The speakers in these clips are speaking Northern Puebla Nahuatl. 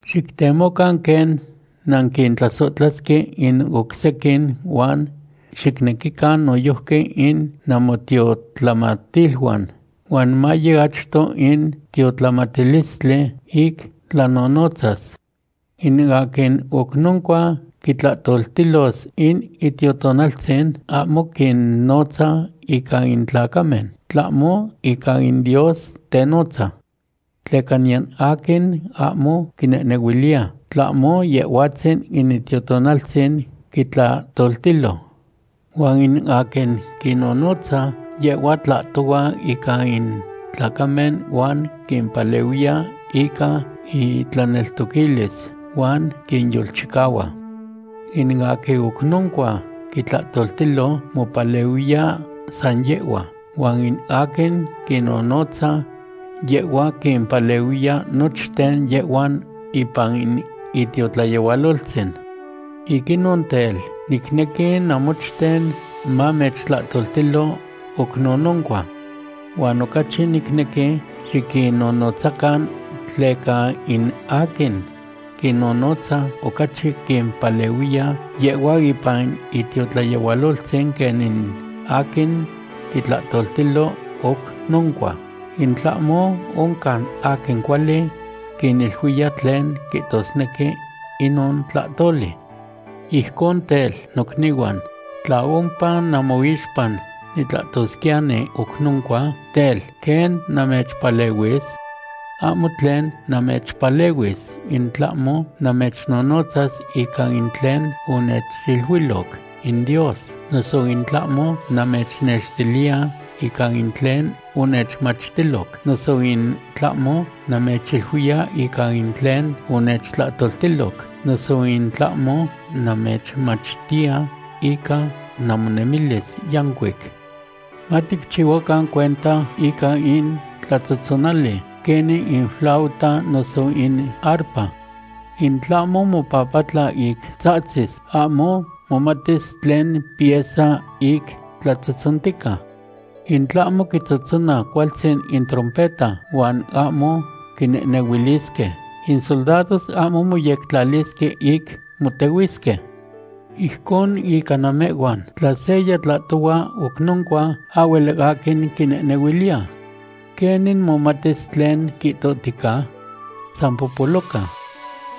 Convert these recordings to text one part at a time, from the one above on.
Xictemocan quen nanquintlasohtlasque in oc sequin huan xicnequican noyojqui in namotiotlamatiluan, huan maye achto in tiotlamatilistli ic tlanonotzas. In aquin oc noncua quitlahtoltilos in Itiotonaltzin ahmo quinnotza ica in tlacamen, tlahmo ica in Dios tenotza. Tleca niyan aquin ahmo quinehnehuiliya, tlahmo Yehhuatzin in Itiotonaltzin quitlahtoltilo. Huan in aquin quinonotza, yehhua tlahtohua ica in tlacamen huan quimpalehuiya ica intlaneltoquilis, huan quinyolchicahua. In aquin oc noncua quitlahtoltilo, mopalehuiya san yehhua, huan in aquin quinonotza, yehhua quimpalehuiya nochten yehhuan ipan in itiotlayehualoltzin. Ic inon tel, nicnequi namochten mamechtlahtoltilo oc nononcua. Huan ocachi nicnequi xiquinnonotzacan, tleca in aquin quinnonotza ocachi quimpalehuiya yehhuan ipan itiotlayehualoltzin quen in aquin quitlahtoltilo oc noncua, in tlahmo oncan aquin cuali quiniluiya tlen quihtosnequi inon tlahtoli. Ijcon tel, nocnihuan, tla ompa namoixpa nitlahtosquiyani oc noncua, tel, ¿quen namechpalehuis? Ahmo tlen namechpalehuis in tlahmo namechnonotzas ica in tlen onechiluiloc in Dios, noso in tlahmo namechnextiliya ica in tlen onechmachtiloc, noso in tlahmo namechiluiya ica in tlen onechtlahtoltiloc, noso in tlahmo namechmachtiya ica namonemilis yancuic. Maticchihuacan cuenta ica in tlatzohtzonali, quenin in flauta noso in arpa. In tlahmo mopapatla ic tzahtzis, ahmo momatis tlen pieza ic tlatzohtzontica. In tlahmo quitzohtzona cualtzin in trompeta huan ahmo quinehnehuilisque, in soldados ahmo moyectlalisque ic motehuisque. Ijcon ica namehhuan. Tla seya tlahtohua oc noncua, ahhuel aquin quinehnehuiliya. ¿Quenin momatis tlen quihtohtica? San popoloca.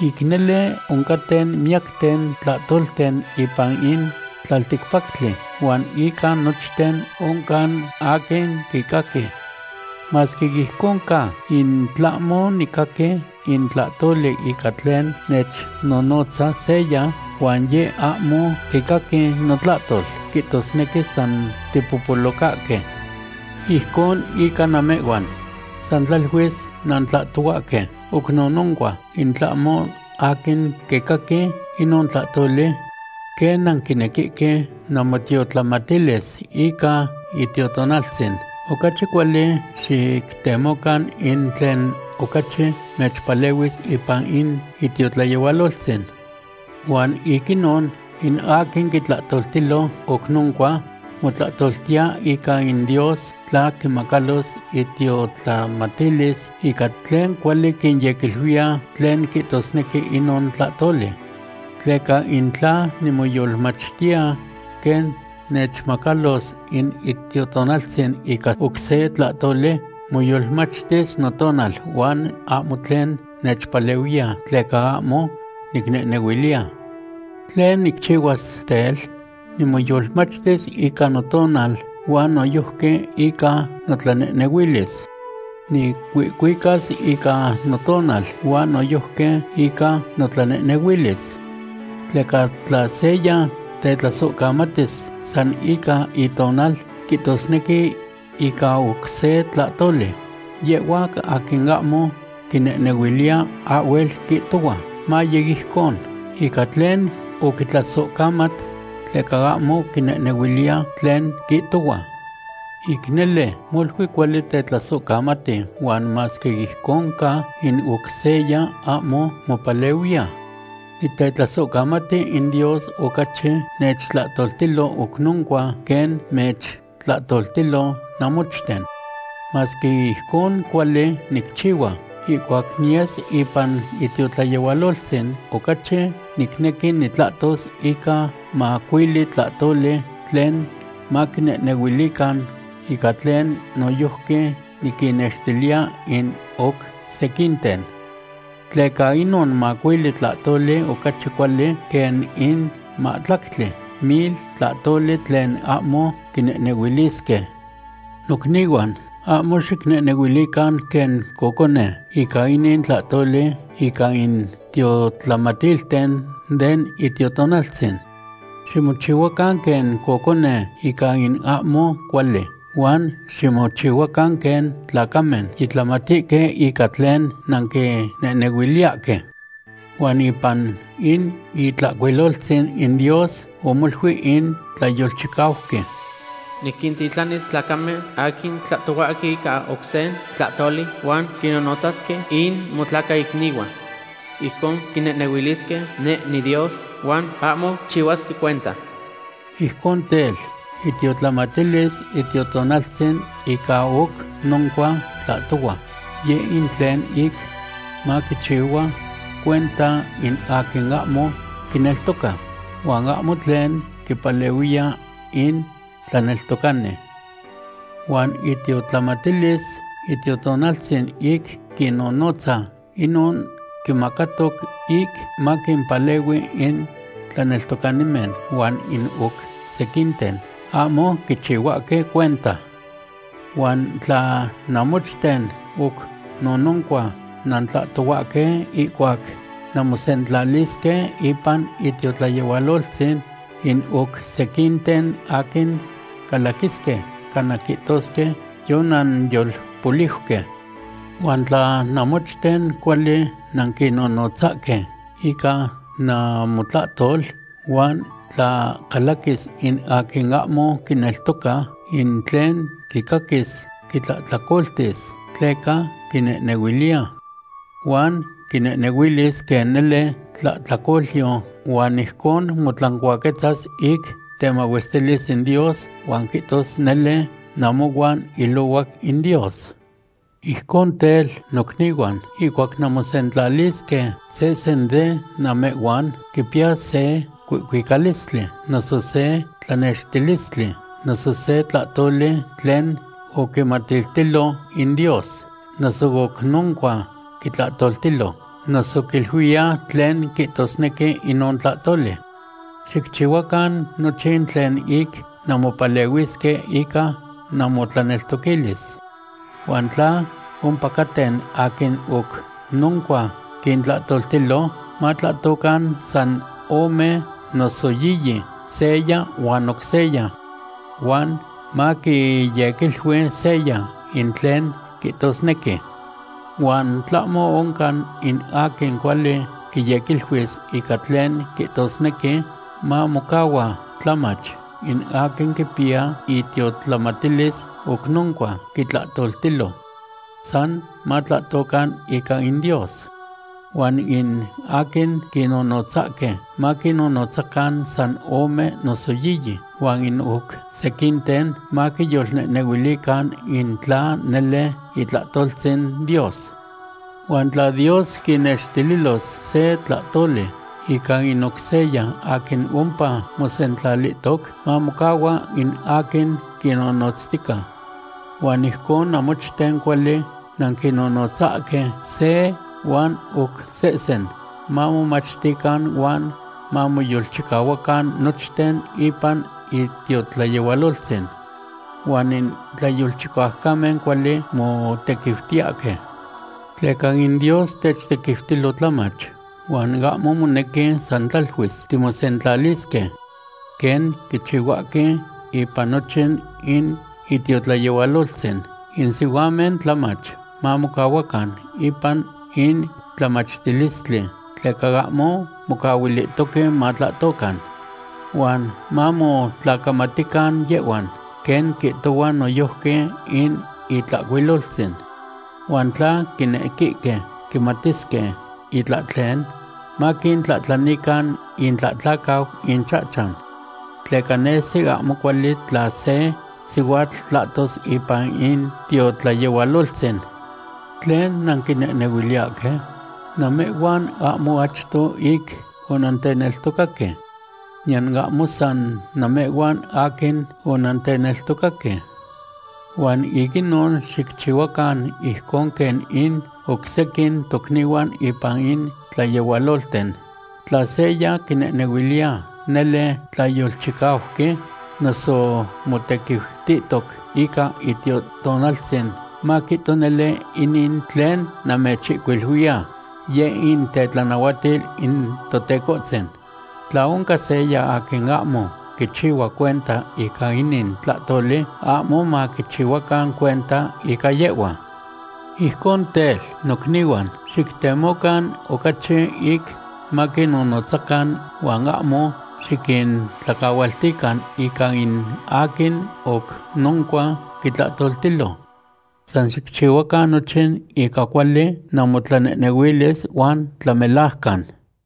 Ic nele oncaten miyacten tlahtolten ipan in tlalticpactli huan ica nochten oncan aquin quicaqui. Masque ijcon ca, in tlahmo nicaqui in tlahtoli ica tlen nechnonotza seya, huan yeh ahmo quicaqui notlahtol, quihtosnequi san tipopolocahque. Ijcon ica namehhuan. San tlaluis nantlahtohuahque oc nononcua in tlahmo aquin quicaqui inon tlahtoli. Quen nanquinequihque namotiotlamatilis ica Itiotonaltzin, ocachi cuali xictemocan in tlen ocachi mechpalehuis ipan in itiotlayehualoltzin. Huan ic inon, in aquin quitlahtoltilo oc noncua, motlatlautiya ica in Dios, tla quimacalos itiotlamatilis ica tlen cuali quinyequiluiya tlen quihtosnequi inon tlahtoli. Tleca in tla nimoyolmachtiya quen nechmacalos in Itiotonaltzin ica oc se tlahtoli, moyolmachtis notonal, huan ahmo tlen nechpalehuiya, tleca ahmo nicnehnehuiliya. ¿Tlen nicchihuas, tel? Nimoyolmachtis ica notonal huan noyojqui ica notlanehnehuilis. Nicuihcuicas ica notonal huan noyojqui ica notlanehnehuilis. Tleca tla seya tetlasohcamatis san ica itonal, quihtosnequi ica oc se tlahtoli, yehhua aquin ahmo quinehnehuiliya ahhuel quihtohua: “Maye ijcon”, ica tlen oquitlasohcamat, tleca ahmo quinehnehuiliya tlen quihtohua. Ic nele, molui cuali tetlasohcamati, huan masque ijcon ca, in oc seya ahmo mopalehuiya. Nitetlasohcamati in Dios ocachi nechtlahtoltilo oc noncua quen mechtlahtoltilo namochten. Masque ijcon cuali nicchihua, ihcuac niyes ipan itiotlayehualoltzin, ocachi nicnequi nitlahtos ica macuili tlahtoli tlen maquinehnehuilican, ica tlen noyojqui niquinnextiliya in oc sequinten. Tleca inon macuili tlahtoli ocachi cuali quen in mahtlactli mil tlahtoli tlen ahmo quinehnehuilisque. Nocnihuan, ahmo xicnehnehuilican quen cocone ica inin tlahtoli ica in tiotlamatilten den Itiotonaltzin. Ximochihuacan quen cocone ica in ahmo cuali, huan ximochihuacan quen tlacamen yitlamatihque ica tlen nanquinehnehuiliyahque. Huan ipan in Itlahcuiloltzin in Dios omoluic in tlayolchicauqui: “Niquintitlanis tlacamen aquin tlahtohuahque ica oc se tlahtoli huan quinnonotzasque in motlacaicnihuan. Ijcon quinehnehuilisque neh niDios huan ahmo quichihuasque cuenta.” Ijcon tel, itiotlamatilis Itiotonaltzin ica oc noncua tlahtohua, yeh in tlen ic maquichihua cuenta in aquin ahmo quineltoca, huan ahmo tlen quipalehuiya in tlaneltocani. Huan itiotlamatilis Itiotonaltzin ic quinonotza, inon quimacatoc ic maquimpalehui in tlaneltocanimen huan in oc sequinten ahmo quichihuahque cuenta. Huan tla namochten oc nonocua nantlahtohuahque ihcuac nanmosentlalisque ipan itiotlayehualoltzin, in oc sequinten aquin calaquisque cana quihtosque yonanyolpoliuque. Huan tla namochten cuali nanquinonotzahque ica namotlahtol huan tla calaquis in aquin ahmo quineltoca, in tlen quicaquis quitlahtlacoltis, tleca quinehnehuiliya. Huan quinehnehuilis quen nele tlahtlacolyo huan ijcon motlancuaquetzas ic temahuestilis in Dios huan quihtos nele namohuan ilohuac in Dios. Ijcon tel, nocnihuan, ihcuac nanmosentlalisque, sehsen de namehhuan quipiya se cuihcuicalistli, noso se tlanextilistli, noso se tlahtoli tlen oquimatiltilo in Dios, noso oc noncua quitlahtoltilo, noso quiluiya tlen quihtosnequi inon tlahtoli. Xicchihuacan nochin tlen ic nanmopalehuisque ica namotlaneltoquilis. Huan tla ompacaten aquin oc noncua quintlahtoltilo, matlahtocan san ome noso yiyi, seya huan oc seya. Huan maquiyequilui seya in tlen quihtosnequi. Huan tlahmo oncan in aquin cuali quiyequiluis ica tlen quihtosnequi, mamocahua tlamach in aquin quipiya itiotlamatilis oc noncua quitlahtoltilo. San matlahtocan ica in Dios. Huan in aquin quinnonotzahque, maquinnonotzacan san ome noso yiyi, huan in oc sequinten maquiyolnehnehuilican in tla nele itlahtoltzin Dios. Huan tla Dios quinextililos se tlahtoli ica in oc seya aquin ompa mosentlalihtoc, mamocahua in aquin quinnonotztica. Huan ijcon namochten cuali nanquinonotzahque se huan oc sehsen, mamomachtican huan mamoyolchicahuacan nochten ipan itiotlayehualoltzin. Huan in tlayolchicaucamen cuali motequiutiyahque. Tleca in Dios techtequiutilo tlamach, huan ahmo monequi san tlaluis timosentlalisque. Quen quichihuahque ipan nochin in itiotlayehualoltzin, in sihuamen tlamach mamocahuacan ipan in tlamachtilistli, tleca ahmo mocahuilihtoque matlahtocan. Huan mamotlacamatican yehhuan, quen quihtohua noyojqui in Itlahcuiloltzin. Huan tla quinequihque quimatisque itlahtlen, maquintlahtlanican intlahtlacau inchahchan. Tleca nesi ahmo cuali tla se sihuatl tlahtos ipan in tiotlayehualoltzin. ¿Tlen nanquinehnehuiliyahque? Namehhuan ahmo achto ic onanteneltocaque. Niyan ahmo san namehhuan aquin onanteneltocaque. Huan ic inon xicchihuacan ijcon quen in oc sequin tocnihuan ipan in tlayehualolten. Tla seya quinehnehuiliya nele tlayolchicauqui, noso motequiutihtoc ica Itiotonaltzin, maquihto nele inin tlen namechihcuiluiya yeh in tetlanahuatil in Totecohtzin. Tla oncan seya aquin ahmo quichihua cuenta ica inin tlahtoli, ahmo maquichihuacan cuenta ica yehhua. Ijcon tel, nocnihuan, xictemocan ocachi ic maquinnonotzacan huan ahmo xiquintlacahualtican ica in aquin oc noncua quitlahtoltilo. San xicchihuacan nochin ica cuali namotlanehnehuilis huan tlamelajcan.